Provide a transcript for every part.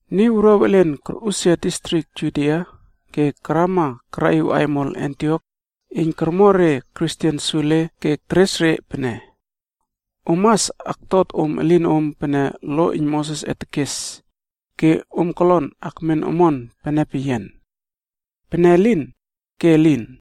Niy wuruaw elen korꞌusia distrik Judia ke karama karaꞌiw aimol Antiok iyn kormo re Kristen sule ke teres re pene, “Om mas aktot om elinom pene lo iyn Mosesꞌe tekes, ke om kolon akmen omon pene peyian. Pene elin, ke elin!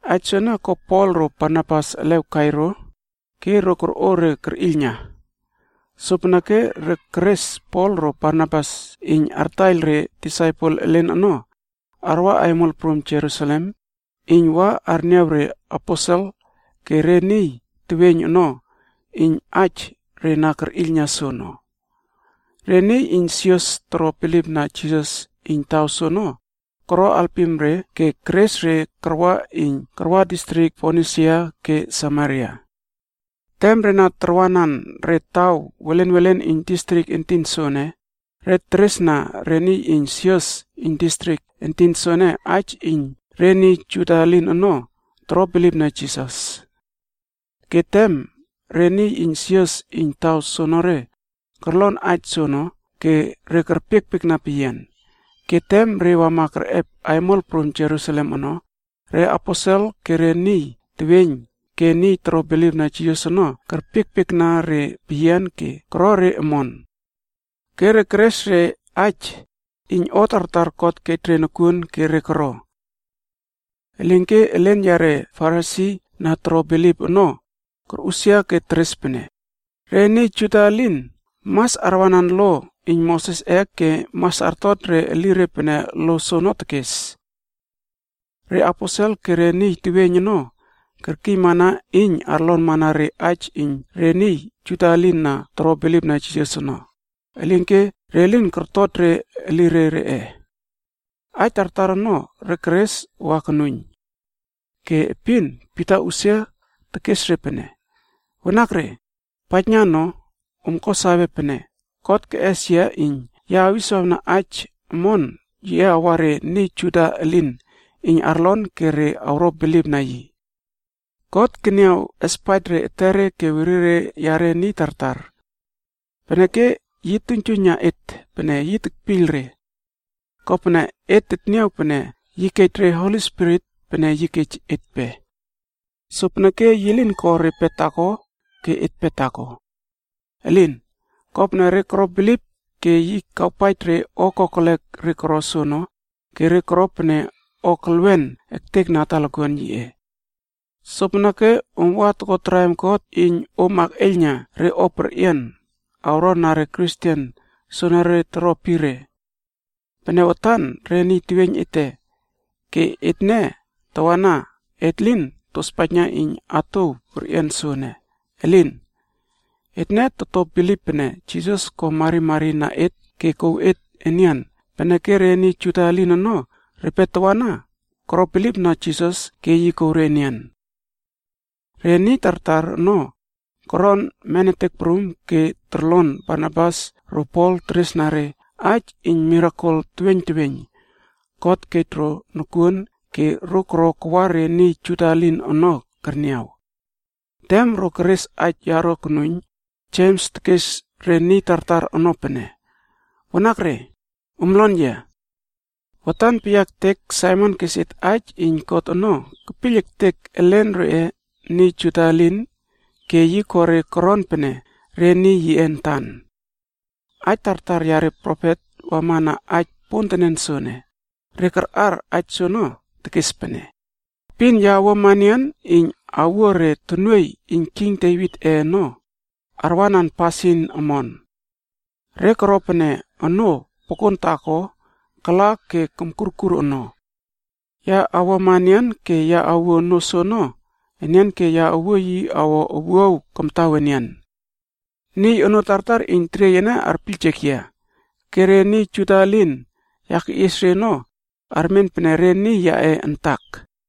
Aij soene ko Pol ro Barnabas elew kai ro ke ro korꞌo re kerꞌiylna. Sopeneke re kerꞌes Pol ro Barnabas iyn artaiyl re disaipel elen ono, arwa aimol prum Jerusalem iyn wa arniaw reaposel ke re niy teweiyn ono iyn aij re na kerꞌiylna soono. Re niy iyn sios toro bilipna Jisas iyn taw soono koro alpim re ke keres re karwa iyn karwa distrik Fonisia ke Samaria. Tem re na tarwanan re taw welenwelen iyn distrik entin soene, re teresna re niy iyn sios iyn distrik entin soene aij iyn re niy Juda elin ono toro bilipna Jisas. Ke tem re niy iyn sios iyn taw soonore korlon aij soono ke re kerpiekpiekna peyian. Ke tem re wama kerꞌep aimol prum Jerusalem ono, re aposel ke re niy teweiyn ke niy toro bilipna Jisas ono kerpiekpiekna re peyian ke koro re omon. Ke re keres re aij iyn o tartar God kej re nokuon ke re koro. Elinke elen yare Farisi na toro bilip ono, korꞌusia ke teres pene, “Re niy Juda elin mas arwanan lo iyn Mosesꞌe ke mas artot re elire pene lo soono tekes.” Re aposel ke re niy teweiyn ono kerkiymana iyn arlonmana re aij iyn re niy Juda elin na toro bilipna Jisas ono, elinke re lin kortot re elire reꞌe. Aij tartar ono re keres wa konuiyn. Ke epin Pita usia tekes re pene, “Wanakre, paijna no om ko sawe pene God keꞌes yia iyn ya awiswawna aij omon yiꞌe awa re niy Juda elin iyn arlon ke re awro bilipna yi. God keniaw espaij re etere ke werire yare niy tartar. Peneke yi tuiynjuiyna et pene yi tekpiyl re. Kopene et teniaw pene yi kej re Holi Spirit pene yi kej etpe. Sopeneke yi lin ko repe taako ke etpe taako. Elin! Kopene re koro bilip ke yi kawpaij re o kokelek re koro soono ke re koro pene o kelwen ektekna na talakuan yiꞌe. Sopeneke om wa toko traim God iyn om akꞌeiyla na re o perꞌian awron na re Kristen soenere toroepire. Pene watan re niy teweiyn ete, ke etne tawana et lin tospaijna iyn atouw perꞌian soene. Elin! Etne toto bilip pene Niy Prum Jisas ko marimari na et ke kouw et enian peneke re niy Juda elin ono repe tawana koro bilipna Jisas ke yi kouw re enian.” Re niy tartar ono koron menetek prum ke torlon Barnabas ro Pol teresna re aij iyn mirakel teweiyn teweiyn God kej ro nokuon ke ro koro kawa re niy Juda elin ono kerniaw. Tem ro keres aij yaro konuiyn, Jems tekes re niy tartar ono pene, “Wanakre, om lon yia. Watan peyia ektek Saimon kes et aij iyn God ono kepiyl ektek elen reꞌe niy Juda elin ke yi ko re koron pene re niy yiꞌe antan. Aij tartar yare profet wama na aij pontenen soene, re karꞌar aij soono, tekes pene, ‘Epin ya awuama enian iyn awuo re tonuoiy iyn king Devitꞌe ono arwanan pasin omon. Re koro pene onoo pokon taako kala ke komkurkur ono. Ya awuama enian ke ya awuo onoo soono enian ke ya awuo yi awo owuaw kamtaw enian. Niy onoo tartar iyn teriey ene arpiyljek yia, ke re niy Juda elin ya keꞌies re ono, armen pene re niy yaꞌe antak.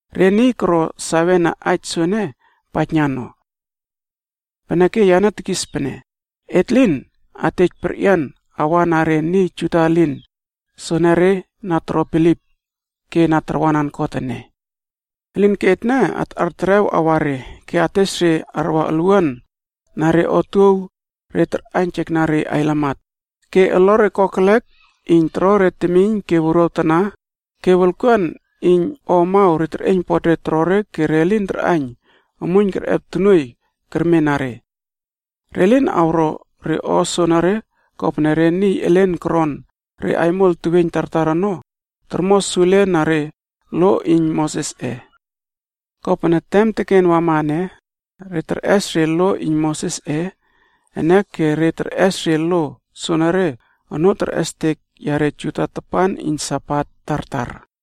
Re niy koro sawe na aij soene paijna no. “Peneke, yane tekis pene, Et lin atej perꞌian awa na re niy Juda elin soenere na toro bilip ke na tarwanan God ene. Elinke etne atꞌar terew awa re, ke ates re arwa olwuan na re otuow re tarꞌaiynjekna re ailamat, ke olore kokelek iyn toro re temiyn ke wuruaw tana ke wolkuan iyn o amaw re teryiypot re torore ke re lin arꞌaiyn omuiyn kerꞌep tonuoiy kermen na re. Re lin awro re o soonore kopene re niy elen koron re aimol teweiyn tartar ono tormo sule na re lo iyn Mosesꞌe. Kopene tem teken wama ene, re terꞌes re lo iyn Mosesꞌe ene ke re terꞌes re lo soenere onoo terꞌestek yare Juda tapan iyn Sabat tartar.”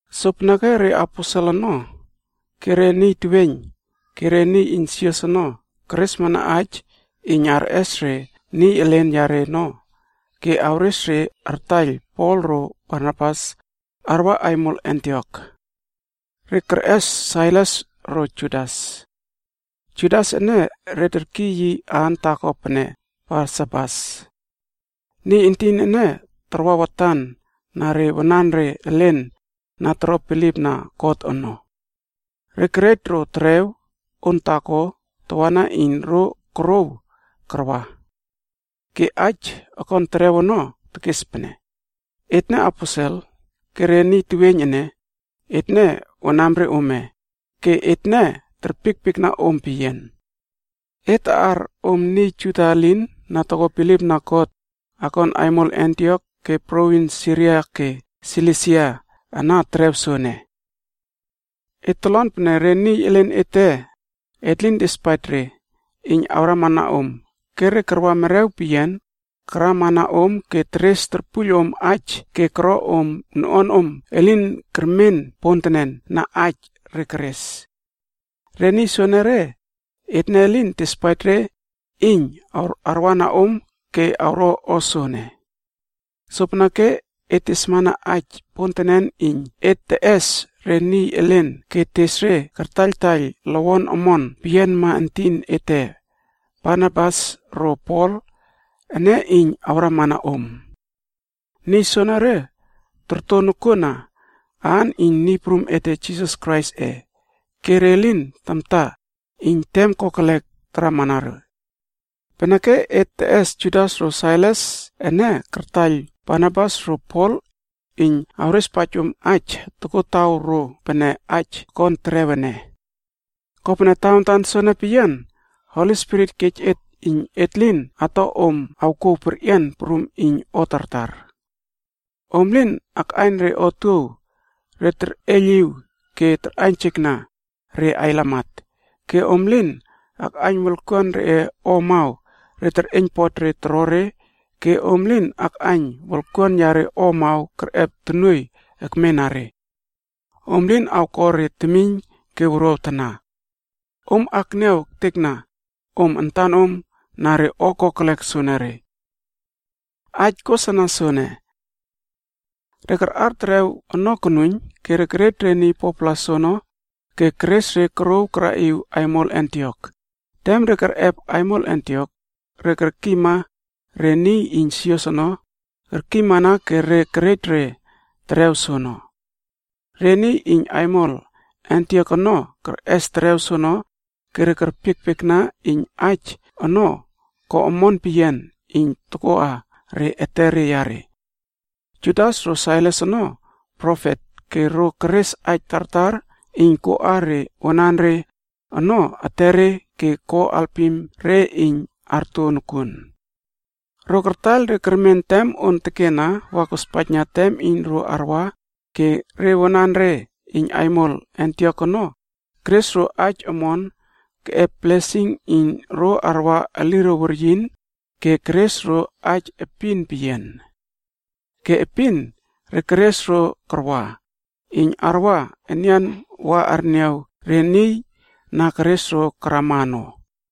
Sopeneke re aposel ono, ke re niy teweiyn, ke re niy iyn sios ono keresmana aij iyn arꞌes re niy elen yare ono ke awres re artaiyl Pol ro Barnabas arwa aimol Antiok. Re kerꞌes Sailas ro Judas. Judas ene re terkiy yi aan taako pene Barsabas. Niy entin ene tarwa watan na re wanare elen na toro bilipna God ono. Re kerej ro terew on taako tawana iyn ro korouw karwa. Ke aij okon terew ono tekes pene, Etne Aposel ke re niy teweiyn ene, etne wanamre ome ke etne terpiekpiekna om peyian. Et taꞌar om niy Juda elin na toko bilipna God akon aimol Antiok ke provins Siria ke Silisia ana terew soene. Et tolon pene re niy elen ete et lin tespaij re iyn arwana om ke re karwa merew peyian karwana om ke teres torpuiyl om aij ke koro om noꞌuanom elin kermen pontenen na aij re keres. Re niy soenere, etne elin tespaij re iyn arwana om ke awro o soene. Sopeneke et tesmana aij pontenen iyn et teꞌes re niy elen ke tes re kartaiyltaiyl lowon omon peyianma entin ete Barnabas ro Pol ene iyn awrama na om. Niy soenere torto nokuon na aan iyn Niy Prum ete Jisas Kraisꞌe ke re lin tamta iyn tem kokelek taramana re. Peneke et teꞌes Judas ro Sailas ene kartaiyl Barnabas ro Pol iyn awrespaij om aij tokotawro pene aij akon terew ene. Kopene tawantan soene peyian Holi Spirit kej et iyn et lin ato om awkouw perꞌian prum iyn o tartar. Om lin akꞌaiyn re otuow re terꞌeiyliw ke tarꞌaiynjekna re ailamat, ke om lin akꞌaiyn wolkuan reꞌe o amaw re terꞌeiynpot re torore ke om lin akꞌaiyn wolkuan yare o amaw kerꞌep tonuoiy ekmena re. Om lin awko re temiyn ke wuruaw tana. Om akniaw ektekna om antanom na re o kokelek soenere. Aij kosana soene. Re karꞌar terew ono konuiyn ke kerej re niy 4-pla soono ke keres re korouw karaꞌiw aimol Antiok. Tem re kerꞌep aimol Antiok, re kerkiyma re niy iyn sios ono kerkiymana ke re kerej re terew soono. Re niy iyn aimol Antiok ono kerꞌes terew soono ke re kerpiekpiekna iyn aij ono ko omon peyian iyn tokoꞌa re etere yare. Judas ro Sailas ono profet ke ro keres aij tartar iyn koꞌa re wanare ono etere ke ko alpim re iyn arto nokuon. Ro kartaiyl re kermen tem on tekena wa kospaijna tem iyn ro arwa ke re wanare iyn aimol Antiok ono keres ro aij omon keꞌep blesing iyn ro arwa eliro weryin ke keres ro aij epin peyian. Ke epin re keres ro karwa,c iyn arwa enian wa arniaw re niy na keres ro karama ono.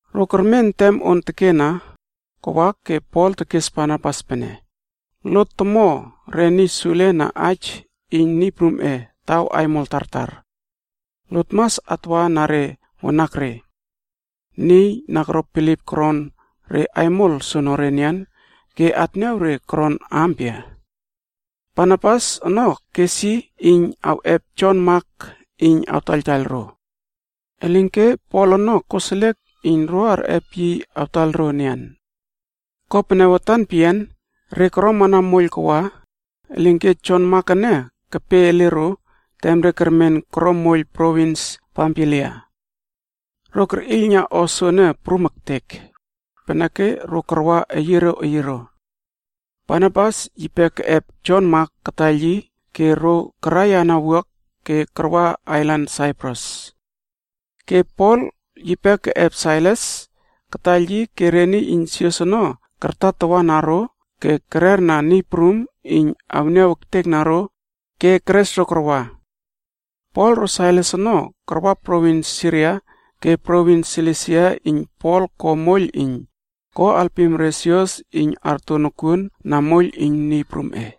Ro kermen tem on tekena kawa ke Pol tekes Barnabas pene, “Lot tomo re niy sule na aij iyn Niy Prumꞌe taw aimol tartar. Lot mas atwa na re wanakre, niy na koro bilip koron re aimol soonore enian ke atniaw re koron ampia?” Barnabas ono kes iyn yi awꞌep Jon Mak iyn awtaiyl ro. Elinke Pol ono koseliek iyn ro arꞌep yi awtaiyl ro enian. Kopene watan peyian re koromana moiyl kawa, elinke Jon Mak ene kepe ele ro tem re kermen koro moiyl provins Pamfilia. Ro kerꞌiylna o soene prum ektek, peneke ro karwa eyiero eyiero. Barnabas yipe keꞌep Jon Mak kataiyl yi ke ro karaiyana wuak ke karwa ailan Saiprus. Ke Pol yipe keꞌep Sailas kataiyl yi ke re niy iyn sios ono kartatawana ro ke kerle ro karwana Niy Prum iyn awniaw ektekna ro ke kerꞌepesie ro karwa. Pol ro Sailas ono karwa provins Siria ke provins Silisia iyn Pol ko moiyl iyn ko alpim re sios iyn arto nokuon na moiyl iyn Niy Prumꞌe.